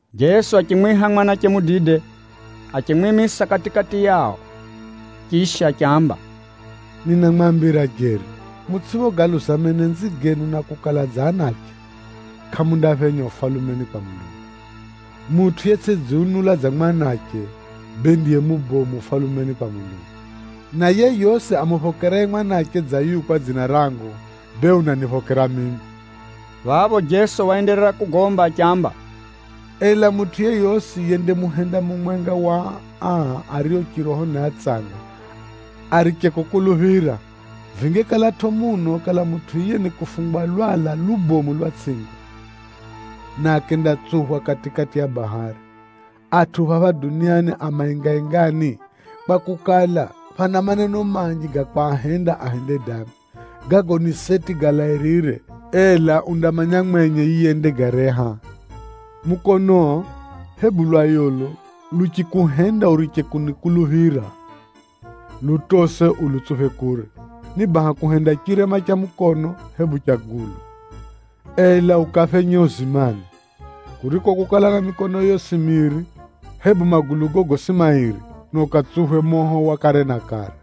Jeso achimwiha mwanache mudide, achimwimisa kati-kati yao. Chisha achiamba, “Ninamwambira jeri, mutsʼiphogaluza menenzi genu na kukala dza anache, kʼamundaphenya Ufalumeni kwa Mulungu. Mutʼu yetsʼidziunula dza mwanache, bee ndiye mubomu Ufalumeni kwa Mulungu. Na yeyosi amuphokeraye mwanache dza yuyu kwa dzina rangu, bee unaniphokera mimi.” Phapho Jeso waenderera kugomba achiamba, “Ela mutʼu yeyosi yendamuhenda mumwenga wa aa ario chiroho ni atsanga ariche kukuluphira, vingekalatʼo muno kala mutʼu yiye ni kufungwa lwala lubomu lwa tsʼingo, na akendatsuphwa kati-kati ya bahari. Atʼu phapha duniani a maengaengani, kwakukala, phana maneno manji ga kwahenda ahende dambi. Gago ni seti galairire, ela undamanya mwenye yiye yendagareha. Mukonoo, hebu lwayolo luchikuhenda uriche kunikuluphira, lutose ulutsuphe kure. Ni baha kuhenda chirema cha mukono, hebu cha gulu, ela ukaphenye uzimani, kuriko kukala na mikonoyo yosi miri, hebu magulugo gosi mairi, na ukatsuphwe moho wa kare na kare.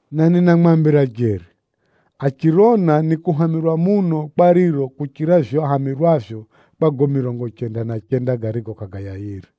Na ninamwambira jeri, achirona nikuhamirwa muno kwa riro kuchira vivyo ahamirwavyo kwa gago mirongo chenda na chenda garigo kʼagayayire.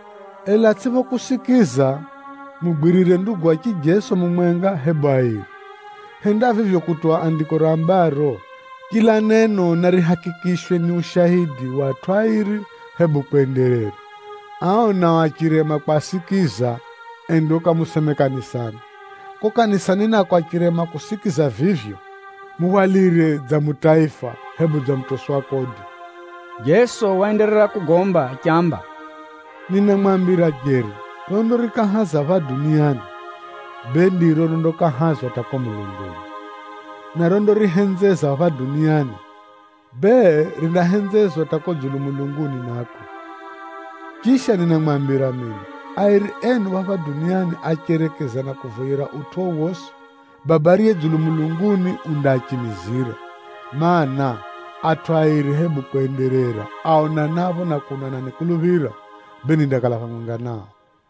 Ela atsʼiphokusikiza, mugwirire ndugu wa chijeso mumwenga, hebu airi. Henda vivyo kutuwa Andiko rambaro, ‘Chila neno narihakikishwe ni ushaidi wa atʼu airi, hebu kwenderera.’ Ao nao achirema kwasikiza, enda ukamuseme kanisani. Kuko kanisani nako achirema kusikiza vivyo, muhwalire dza mutaifa, hebu dza mutosi wa kodi.” Jeso waenderera kugomba achiamba, “Ninamwambira jeri, rondarikahaza phapha duniani, bee ndiro rondakahazwa hata kuko mulunguni, na rondarihenzeza phapha duniani, bee rindahenzezwa hata kuko dzulu mulunguni nako. Chisha ninamwambira jeri mino, airi enu phapha duniani acherekezana kuvoyera utʼu wowosi, Baba ariye dzulu mulunguni undaachimizira. Maana, atʼu airi hebu kwenderera, aonanapho na kuno ananikuluphira, bee nindakala phamwenga nao.”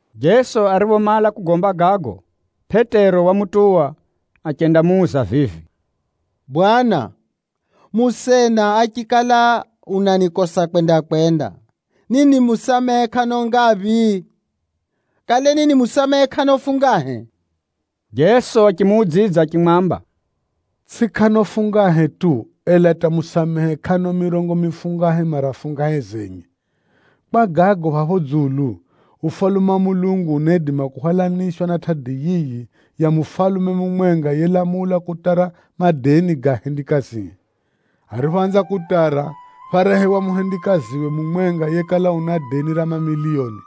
Jeso ariphomala kugomba gago, Pʼetero wamutuwa achendamuuza vivi, “Bwana, musena achikala unanikosa kwenda-kwenda, ninimusamehe kʼano ngaphi? Kale ninimusamehe kʼano fungahe?” Jeso achimuudzidza achimwamba, “Tsʼi kʼano fungahe tu, ela hata musamehe kʼano mirongo mifungahe mara fungahe zenye. “Kwa gago phapho dzulu, Ufalume wa Mulungu unaidima kuhwalanishwa na tʼadi yiyi ya mufalume mumwenga yelamula kutara madeni ga ahendikazie. Ariphoanza kutara, phárehewa muhendikaziwe mumwenga yekala una deni ra mamiliyoni.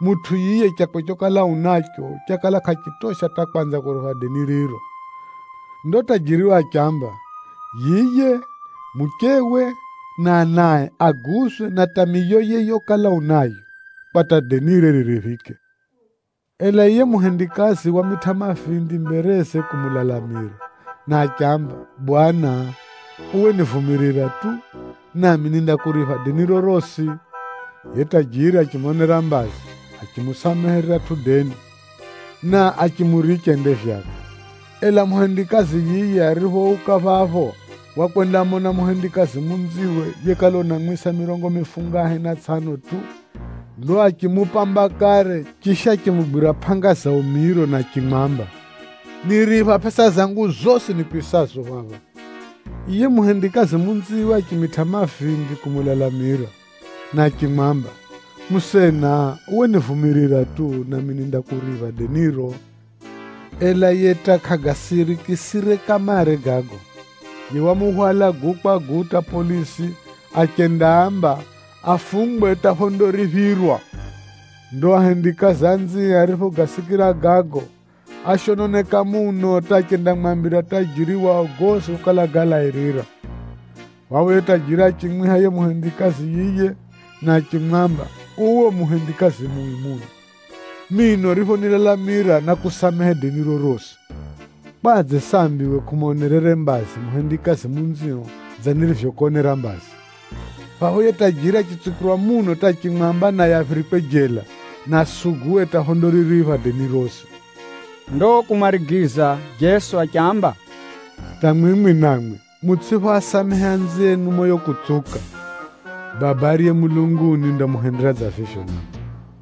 Mutʼu yiye chakwe chokala unacho, chakala kʼachitosha hata kwanza kuripha deni riro. Ndo tajiriwe achiamba, yiye, muchewe na anae aguzwe na hata miyoye yokala unayo, kwa hata denire ririphike. “Ela yiye muhendikazi wamitʼa mavindi mbereze kumulalamira, na achiamba, ‘Bwana, uwe nivumirira tu, nami nindakuripha deniro rosi.’ Yiye tajiri achimonera mbazi, achimusamehe riratʼu deni, na achimuricha ende vyakwe. “Ela muhendikazi yiye ariphouka phapho, wakwendamona muhendikazi munziwe yekala unamwisa mirongo mifungahe na tsʼano tu. Ndo achimupamba kare, chisha achimugwira pʼanga za umiro na achimwamba, ‘Niripha pʼesa zangu zosi nikwisazo phapha!’ “Yiye muhendikazi munziwe achimitʼa mavindi kumulalamira, na achimwamba, ‘Musena, uwe nivumirira tu, nami nindakuripha deniro.’ Ela yiye hata kʼagasirikisire kamare gago. Yiye wamuhwala guu kwa guu hata polisi achendaamba afungwe hata phondariphirwa. Ndo ahendikazi anzie ariphogasikira gago, áshononeka muno hata achendamwambira tajiri wao gosi gokala galairira. “Phapho yiye tajiri achimwiha yiye muhendikazi yiye na achimwamba, ‘Uwe u muhendikazi mui muno! Mino uriphonilalamira, nákusamehe deniro rosi. Kwadze sambi uwe kʼumonerere mbazi muhendikazi munzio dza nirivyokonera mbazi?’ Phapho yiye tajiri achitsukirwa muno hata achimwamba naye aphirikwe jela, na asuguwe hata phondariripha deni rosi.” Ndo kumarigiza Jeso achiamba, “Hata mwimwi namwi mutsʼiphoasamehe anzienu moyo kutsuka, Baba ariye mulunguni undamuhendera dza vivyo namwi.”